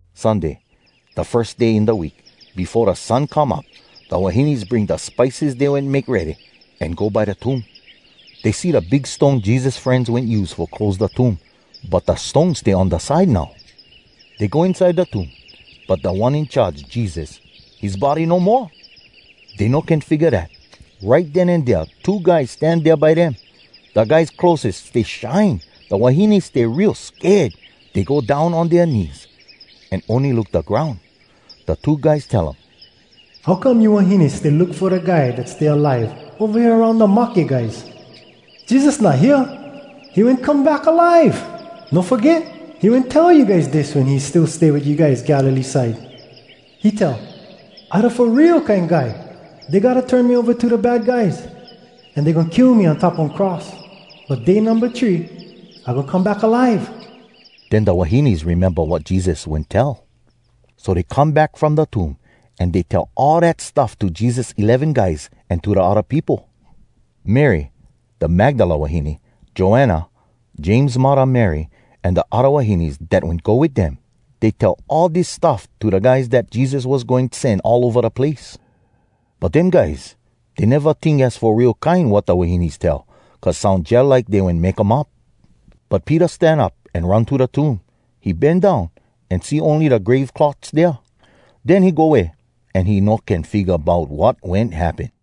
Sunday, da firs day in da week, befo da sun come up, da wahines bring da spices dey wen make ready, an go by da tomb. Dey see da big stone Jesus frenz wen use fo close da tomb. But da stone stay on da side now. Dey go inside da tomb, but Da One In Charge, Jesus, his body no moa! Dey no can figga dat. Right den an dea two guys stan dea by dem. Da guys clotheses stay shine. Da wahines stay real sked. Dey go down on dea knees, an ony look da groun. Da two guys tell um, “How come you wahines stay look fo da guy dat stay alive, ova hea aroun da mahke guys? Jesus not hea; he wen come back alive! No foget, he wen tell you guys dis wen he still stay wit you guys Galilee side. He tell, ‘I Da Fo Real Kine Guy. Dey gotta turn me ova to da bad guys. An dey goin kill me on top one cross. But day numba three, I goin come back alive!’” Den da wahines rememba wat Jesus wen tell. So dey come back from da tomb, an dey tell all dat stuff to Jesus eleven guys an to da odda peopo. Mary da Magdala wahine, Joanna, James muddah Mary, an da odda wahines dat wen go wit dem, dey tell all dis stuff to da guys dat Jesus was goin sen all ova da place. But dem guys, dey neva tink az fo real kine wat da wahines tell, cuz soun jalike dey wen make um up. But Peter stan up an run to da tomb. He bend down, an see ony da grave cloths dea. Den he go way, an he no can figga bout wat wen happen.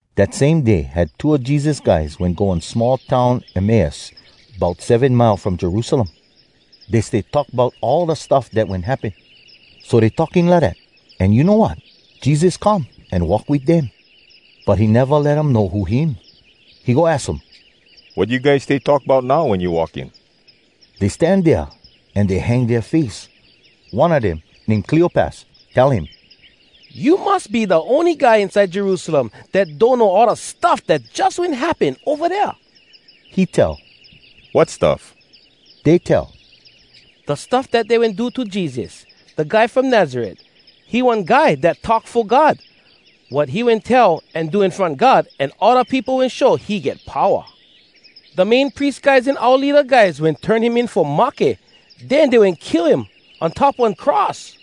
Dat same day had two a Jesus guys wen go one small town Emmaus, bout seven mile from Jerusalem. Dey stay talk bout all da stuff dat wen happen. So dey talking lidat, an you know wat? Jesus come, an walk wit dem. But he neva let um know who him. He go aks um, “Wat you guys stay talk bout now wen you walking?” Dey stan dea, an dey hang dea face. One a dem, name Cleopas, tell him, “You mus be da ony guy inside Jerusalem dat donno all da stuff dat jus wen happen ova dea.” He tell, “Wat stuff?” Dey tell, “Da stuff dat dey wen do to Jesus, da guy from Nazaret. He one guy dat talk fo God. Wat he wen tell an do in front God an all da peopo wen show he get powa. Da Main Pries guys an oua leada guys wen turn him in fo mahke. Den dey wen kill him on top one cross.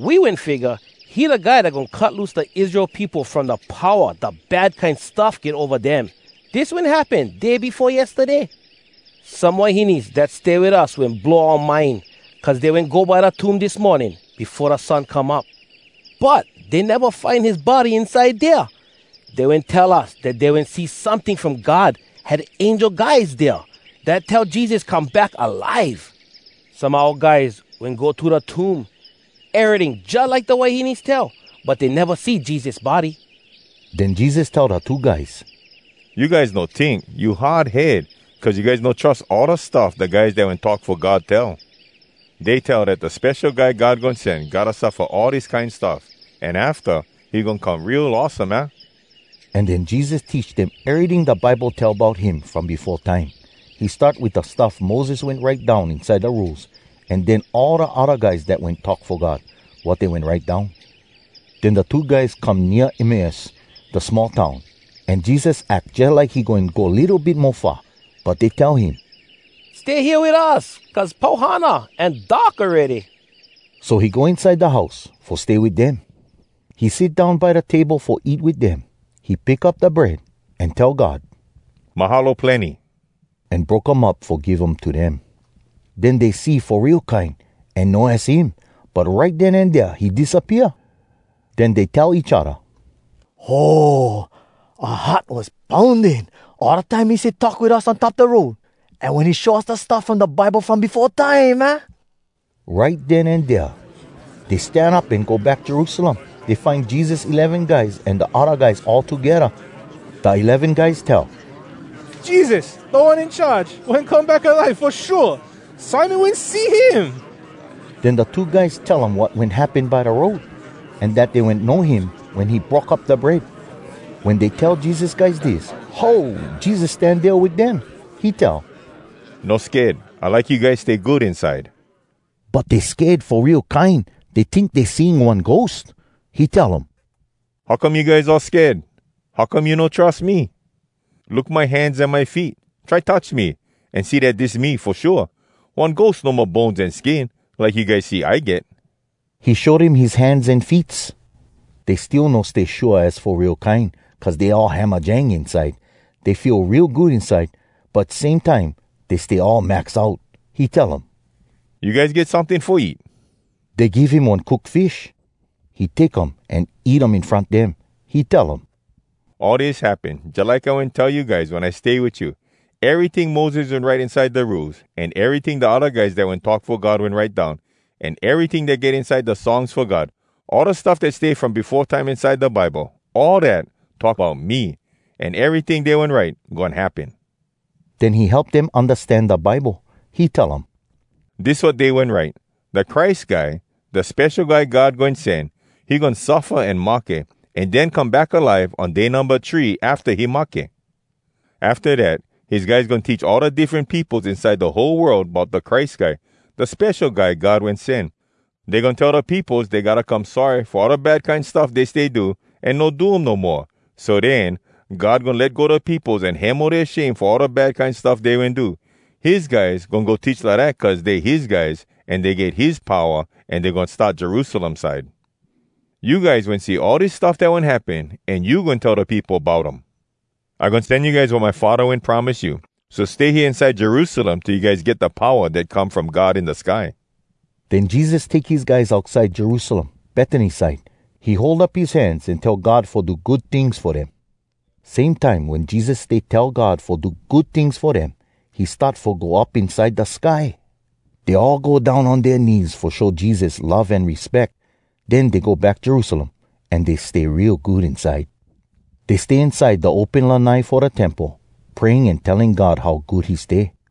We wen figga he da guy dat goin cut loose da Israel peopo from da powa da bad kine stuff get ova dem. Dis wen happen day befo yestaday. Some wahines dat stay wit us wen blow oua mind, cuz dey wen go by da tomb dis morning, befo da sun come up. But dey neva find his body inside dea! Dey wen tell us dat dey wen see someting from God—had angel guys dea, dat tell Jesus come back alive! Some a oua guys wen go to da tomb. Eryting stay jalike da wahines tell. But dey neva see Jesus body.” Den Jesus tell da two guys, “You guys no tink! You hard head, cuz you guys no trus all da stuff da guys dat wen talk fo God tell! Dey tell dat da Spesho Guy God Goin Sen gotta suffa all dis kine stuff, an afta, he goin come real awesome, aah?” An den Jesus teach dem eryting da Bible tell bout him from befo time. He start wit da stuff Moses wen write down inside da Rules, an den all da odda guys dat wen talk fo God, wat dey wen write down. Den da two guys come nea Emmaus, da small town, an Jesus ack jalike he goin go litto bit mo far. But dey tell him, “Stay hea wit us, cuz pau hana, an dark awready.” So he go inside da house, fo stay wit dem. He sit down by da table fo eat wit dem. He pick up da bread, an tell God “Mahalo plenny!” an broke um up fo give um to dem. Den dey see fo real kine, an know az him. But right den an dea he disappea. Den dey tell each odda, “Ho! Oua heart was pounding, all da time he stay talk wit us on top da road, an wen he show us da stuff from da Bible from befo time, aah?” Right den an dea dey stan up an go back Jerusalem. Dey find Jesus eleven guys an da odda guys all togedda. Da eleven guys tell, “Jesus, Da One In Charge, wen come back alive, fo shua! Simon wen see him!” Den da two guys tell um wat wen happen by da road, an dat dey wen know him wen he broke up da bread. Wen dey tell Jesus guys dis, ho! Jesus stan dea wit dem! He tell, “No sked. I like you guys stay good inside.” But dey sked fo real kine! Dey tink dey seeing one ghost! He tell um, “How come you guys all sked? How come you no trus me? Look my hands an my feet. Try touch me, an see dat dis me, fo shua! One ghost no mo bones an skin, like you guys see I get.” He show dem his hands an feets. Dey still no stay shua az fo real kine, cuz dey all hamajang inside. Dey feel real good inside, but same time, dey stay all max out. He tell um, “You guys get someting fo eat?” Dey give him one cook fish. He take um an eat um in front dem. He tell um, “All dis happen jalike I wen tell you guys wen I stay wit you. Eryting Moses wen write inside da Rules, an eryting da odda guys dat wen talk fo God wen write down, an eryting dat get inside da Songs Fo God—all da stuff dat stay from befo time inside da Bible, all dat, talk bout me! An eryting dey wen write, goin happen!” Den he help dem undastan da Bible. He tell um, “Dis wat dey wen write, ‘Da Christ Guy, da Spesho Guy God Goin Sen, he goin suffa an mahke, an den come back alive on day numba three afta he mahke. Afta dat, his guys goin teach all da diffren peopos inside da whole world bout da Christ Guy, da Spesho Guy God Wen Sen. Dey goin tell da peopos dey gotta come sorry fo all da bad kine stuff dey stay do, an no do um no moa. So den, God goin let go da peopos an hemo dea shame fo all da bad kine stuff dey wen do. His guys goin go teach lidat cuz dey his guys an dey get his powa, an dey goin start Jerusalem side.’ You guys wen see all dis stuff dat wen happen, an you goin tell da peopo bout um. I goin sen you guys wat my Faddah wen promise you. So stay hea inside Jerusalem till you guys get da powa dat come from God in da sky.” Den Jesus take his guys outside Jerusalem, Betany side. He hold up his hands an tell God fo do good tings fo dem. Same time wen Jesus stay tell God fo do good tings fo dem, he start fo go up inside da sky. Dey all go down on dea knees fo show Jesus love an respeck. Den dey go back Jerusalem. An dey stay real good inside. Dey stay inside da open lanai fo da Temple, praying an telling God how good he stay.